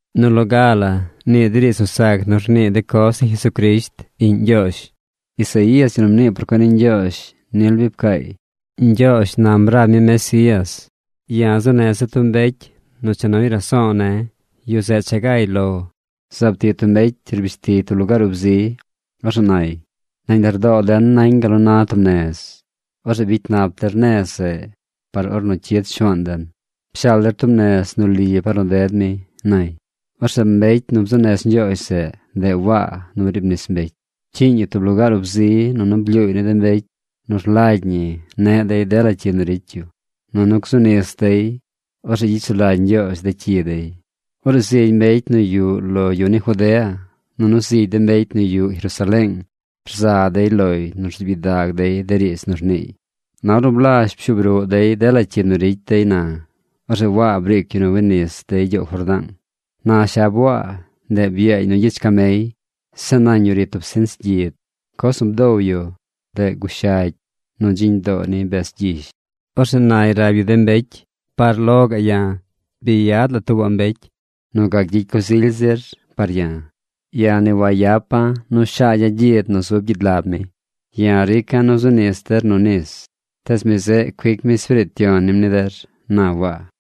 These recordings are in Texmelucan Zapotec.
Nu loga la ni de riidz nu sac nu rnii de coz ni Jesucrisht, iꞌñ Ñgyoozh. Isaías, yu nu mnii por cuen ni Ñgyoozh nil bi pcaay: Ñgyoozh nam rab mi Mesías: Ya̱ zuu neza̱ tub mbecy nu cha nuy raso̱o̱ ne̱. Yu zeꞌ cha gay lo ru. Zaab tiꞌ tub mbecy rbishtiy tub lugaar ub zi. Orzeꞌ nay: “Nañ lardoo den nañ gal nu na tub nez. Orzeꞌ bicy nap der nez zeꞌ par ornu cyid Shuaan den. Pshaal der tub nez nu li par nu ded mi”, nay. Orzeꞌ mbecy nu bzuu nez Ñgyoozh zeꞌ, ndeꞌ Waa nu briib nis mbecy. Pcyiiñ yu tub lugaar ub zi nunu blyuuy ni de mbecy nu rlagy ñi neꞌ dey dela cyi nu ricy yu, nunu gzu nis dey. Orzeꞌ gyicy sulagy Ñgyoozh de cyi dey. Orzeꞌ zigy mbecy nu yuꞌ lo yu ni Judea nunu zigy de mbecy nu yuꞌ Jerusaleeng rza dey loy nu rzuub gyidag dey de riidz nu rniiy. Na ornu blazh pshuub ruꞌ dey dela cyi nu ricy dey na, orzeꞌ Waa briic yu nu wi nis dey gyoow Jordaang. Na shab Waa, ndeꞌ byaañ nu gyich camey. Zeꞌ nañ yu ri tub sinch gyid. Coz nu bdow yu, ndeꞌ gushagy nu dziñ doo ni bez gyish. Orzeꞌ nay rab yu de mbecy: ―Par lo ya̱ bi yad la tuubaꞌ mbecy nu gac gyicy coz ily zir par ya̱. Ya̱ ni wayapa̱ nu shaagya̱ gyid nu zub gyid lab mi. Ya̱ rica̱ nu zu nis der nu nis, tees mi zeꞌ cuic mi Espiriit Yon ni der ―na Waa.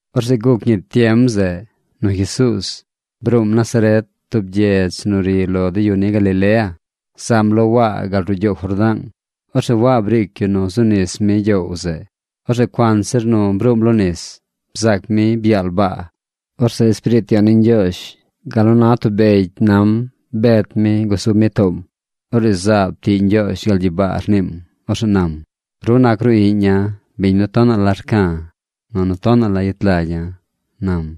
Orzeꞌ guc ñi tiem zeꞌ nu Jesuuz bruum Nazaret, tub gyedz nu ri lo de yu ni Galilea. Zam lo Waa gal ruꞌ gyoow Jordaang. Orzeꞌ Waa briic yu nu zu nis mi gyoow zeꞌ. Orzeꞌ cuanzir nu bruum lo nis, bzaac mi byaal baa. Orzeꞌ Espiriit Yon ni Ñgyoozh gal nu na tub begy nam bet mi gusub mi toom. Orzeꞌ zaab tiꞌ Ñgyoozh gal gyibaa rniim. Orzeꞌ nam: ―Ru nac ru iꞌña̱, biñ nu tonaꞌ la rca̱, nunu tonaꞌ la yet lagya̱ ―nam.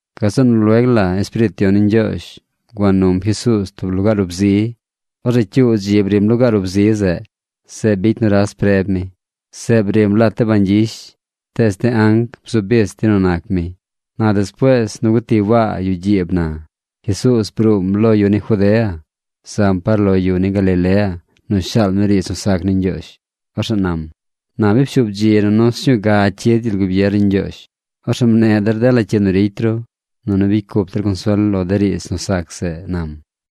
Gazeꞌ nu lueg la Espiriit Yon ni Ñgyoozh gua num Jesuuz tub lugaar ub zi. Orzeꞌ cyuu dzi brim lugaar ub zi zeꞌ. Zeꞌ bicy nuras preb mi. Zeꞌ brim lat de bañ gyish. Tees de anc bzu bich dey nu nac mi. Na despuees nu guti Waa yuꞌ gyiib na, Jesuuz bruum lo yu ni Judea, zam par lo yu ni Galilea nu shaal mi riidz nu sac ni Ñgyoozh. Orzeꞌ nam: ―Na bi pshuub dzi nunu sñuu ga cyid gyel gubier ni Ñgyoozh. Orzeꞌ mneꞌ der dela cyi nu ricy ru, nunu bicy cup der consuel lo de riidz nu sac zeꞌ ―nam.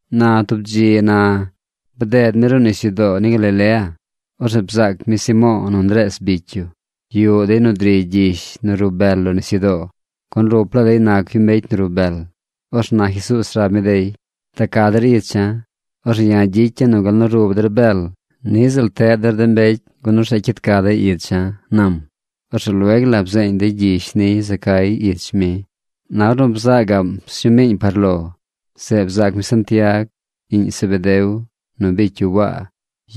Na tub dzi na bded mi ruꞌ nisyudoo ni Galilea. Orzeꞌ bzaac mi Simo̱o̱ nu Ndrees bicy yu. Yuꞌ dey nu driy gyish nu rub bel lo nisyudoo, gun ruplaa dey nac yu mbecy rub bel. Orzeꞌ na Jesuuz rab mi dey: ―Da ca der icha̱. Orzeꞌ ya̱ gyicya̱ nu gal nu rub der bel, niꞌ ziꞌl teꞌ der mbecy gun orzeꞌ cyid ca dey icha̱ ―nam. Orzeꞌ lueg la bzeeñ dey gyish niy za cay ich mi. Na ornu bza gaꞌm sñuu miiñ par lo, zeꞌ bzaac mi Santiag, iꞌñ Zebedeo, nu bicy yu Waa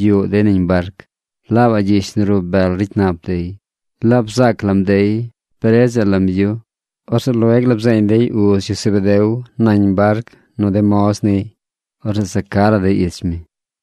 yuꞌ dey nañ barc. Laabaꞌ gyish nu rub bel ricy nap dey. Laab bzaac lam dey bredzaꞌ lam yu. Orzeꞌ lueg la bzeeñ dey uz yu Zebedeo nañ barc nu de moz niy. Orzeꞌ za ca la dey ich mi.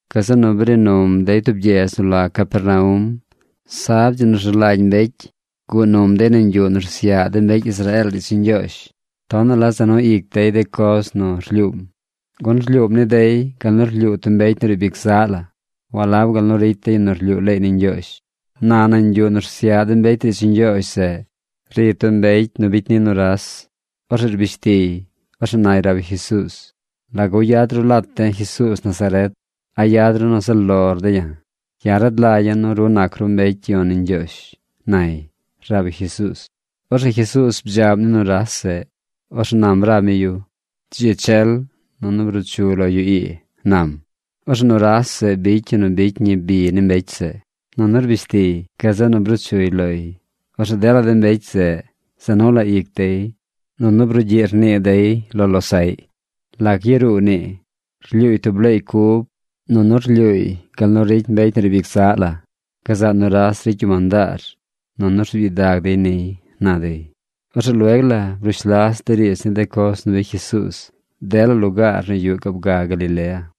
Gazeꞌ nu bri num dey tub gyedz nu la Capernaum. Sab, dzi nu rzu lagy mbecy, guꞌ num dey nañ yuꞌ nu rsyaꞌ de mbecy Israeel riidz ni Ñgyoozh. Tonaꞌ la za nu ic dey de coz nu rlyuum, gun rlyuum ni dey gal nu rlyuu tub mbecy nu riib ic zaꞌ la, walab gal nu ricy de yu nu rlyuu leey ni Ñgyoozh. Na nañ yuꞌ nu rsyaꞌ de mbecy riidz ni Ñgyoozh zeꞌ, ri tub mbecy nu bicy ni nuras. Orzeꞌ rbish tiy. Orzeꞌ nay rab yu Jesuuz: ―¿Lagu yad ru lat de̱ Jesuuz Nazaret? ¿A yad ru nu zaꞌ lor de̱ ya̱? Ya̱ rad lagya̱ nu ru nac ru mbecy yon ni Ñgyoozh ―nay rab yu Jesuuz. Orzeꞌ Jesuuz bdzaꞌm ni nuras zeꞌ. Orzeꞌ nam rab mi yu: ―Dzi chel nunu bruu chu lo yu ii ―nam. Orzeꞌ nuras zeꞌ bicy yu nu bicy ñi bi ni mbecy zeꞌ. Nunu rbish tiy. Gazeꞌ nu bruu chuy loy. Orzeꞌ dela de mbecy zeꞌ za nu la ic dey nunu brugyiꞌ rnii dey lo losaꞌy: ―¿Lac yaruu nii? Rlyuuy tub leey cub, nunu rlyuuy gal nu ricy mbecy nu riib ic zaꞌ la. ¡Gazaꞌ nuras ricy yu mandaar, nunu rzuub gyidag dey niy! ―na dey. Orzeꞌ lueg la brush las de riidz ni de coz nu bicy Jesuuz dela lugaar nu yuꞌ gaab ga Galilea.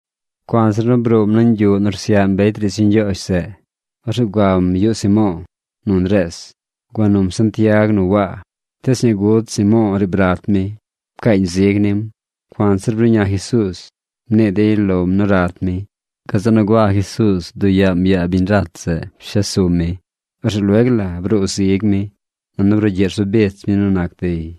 Cuanzir bruum nañ yuꞌ nu rsyaꞌ mbecy riidz ni Ñgyoozh zeꞌ, orzeꞌ guam yuꞌ Simo̱o̱ nu Ndrees. Gua num Santiag nu Waa. Tees ñaa gud Simo̱o̱ riib rat mi. Pcaañ zig nim. Cuanzir bruꞌña Jesuuz, mnii dey lom nu rat mi. Gazeꞌ nu gua Jesuuz bduꞌ yaam yaa biñ rat zeꞌ pshes sum mi. Orzeꞌ lueg la bruu zigy mi, nunu brugyiꞌ rzu bich mi nu nac dey.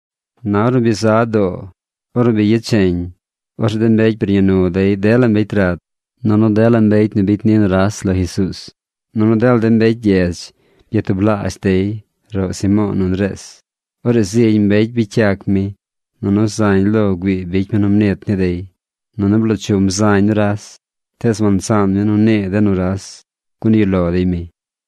Na ornu bi za doo, or nu bi yecheñ, orzeꞌ de mbecy bruꞌña nu dey dela mbecy rat nunu dela mbecy nu bicy ni nuras lo Jesuuz. Nunu dela mbecy gyedz byatublaazh dey roꞌ Simo̱o̱ nu Ndrees. Orzeꞌ zigy mbecy bicy yac mi, nunu zañ lo güii bicy mi nu mnit ni dey. Nunu bloo chum zañ nuras. Tees wansaan mi nu nii de nuras, gun yuꞌ lo dey mi.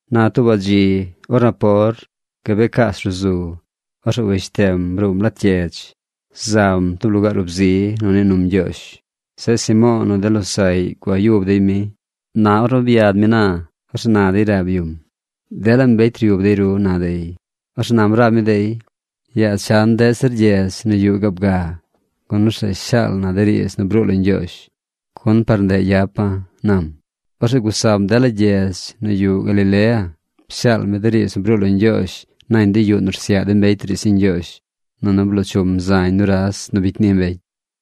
Na tuubaꞌ dzi, or napor, gabee caas ruꞌ zu, orzeꞌ weshtem. Bruum lat gyedz. Zam tub lugaar ub zi nu nii num Ñgyoozh. Zeꞌ Simo̱o̱ nu de losaꞌy gua yub dey mi. Na ornu byad mi na, orzeꞌ na dey rab yum: ―Dela mbecy ryub dey ru ―na dey. Orzeꞌ nam rab mi dey: ―Yaa chan deꞌ zir gyedz nu yuꞌ gaab ga, gun orzeꞌ shaal na de riidz nu bruu lo Ñgyoozh, gun par ndeꞌ yapa̱ ―nam. Orzeꞌ gusam dela gyedz nu yuꞌ Galilea. Pshaal mi de riidz nu bruu lo Ñgyoozh nañ de yuꞌ nu rsyaꞌ de mbecy riidz ni Ñgyoozh. Nunu bloo chum zañ nuras nu bicy ni mbecy.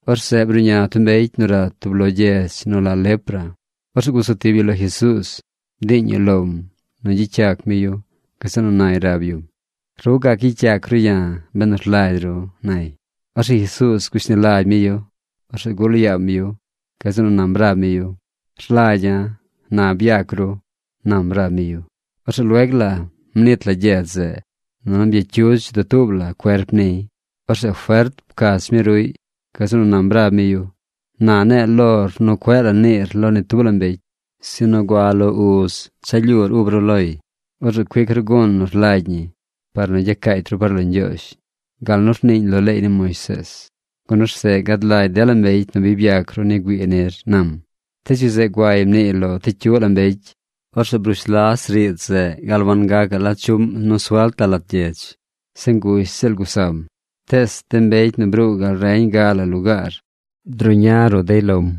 Orzeꞌ bruꞌña tub mbecy nu rat tub lo gyedz nu la lepra. Orzeꞌ gusu tib yu lo Jesuuz bdiiñ yu lom nu gyicy yac mi yu. Gazeꞌ nu nay rab yum: ―Ru gac gyicy yac ru ya̱ benu rlagy ru ―nay. Orzeꞌ Jesuuz gushni lagy mi yu. Orzeꞌ gul yaam yu. Gazeꞌ nu nam rab mi yu: ―Rlagya̱. ¡Na byac ru! ―nam rab mi yu. Orzeꞌ lueg la mnit la gyedz zeꞌ, nunu byacyudz dutuub la cuerp niy. Orzeꞌ fert pcach mi ruꞌy. Gazeꞌ nu nam rab mi yu: ―Na ne̱e̱ lor nu cueꞌ la niir lo ni tub la mbecy, sinu gua lo uz cha lyuur ub ru loy. Orzeꞌ cuic ru gun nu rlagy ñi par nu gyacaacy ru par lo Ñgyoozh gal nu rniiñ lo leey ni Moisees, gun orzeꞌ gad lagy dela mbecy nu bi byac ru ni güii nir ―nam. Tees yu zeꞌ guay mniiy lo ti cyuꞌ la mbecy. Orzeꞌ brush las riidz zeꞌ gal wangacaꞌ la chuꞌm nu suelt la lat gyedz. Zeꞌ ngush ziꞌl gusam. Tees de mbecy nu bruu gal reñ ga la lugaar druꞌña ruꞌ dey lom.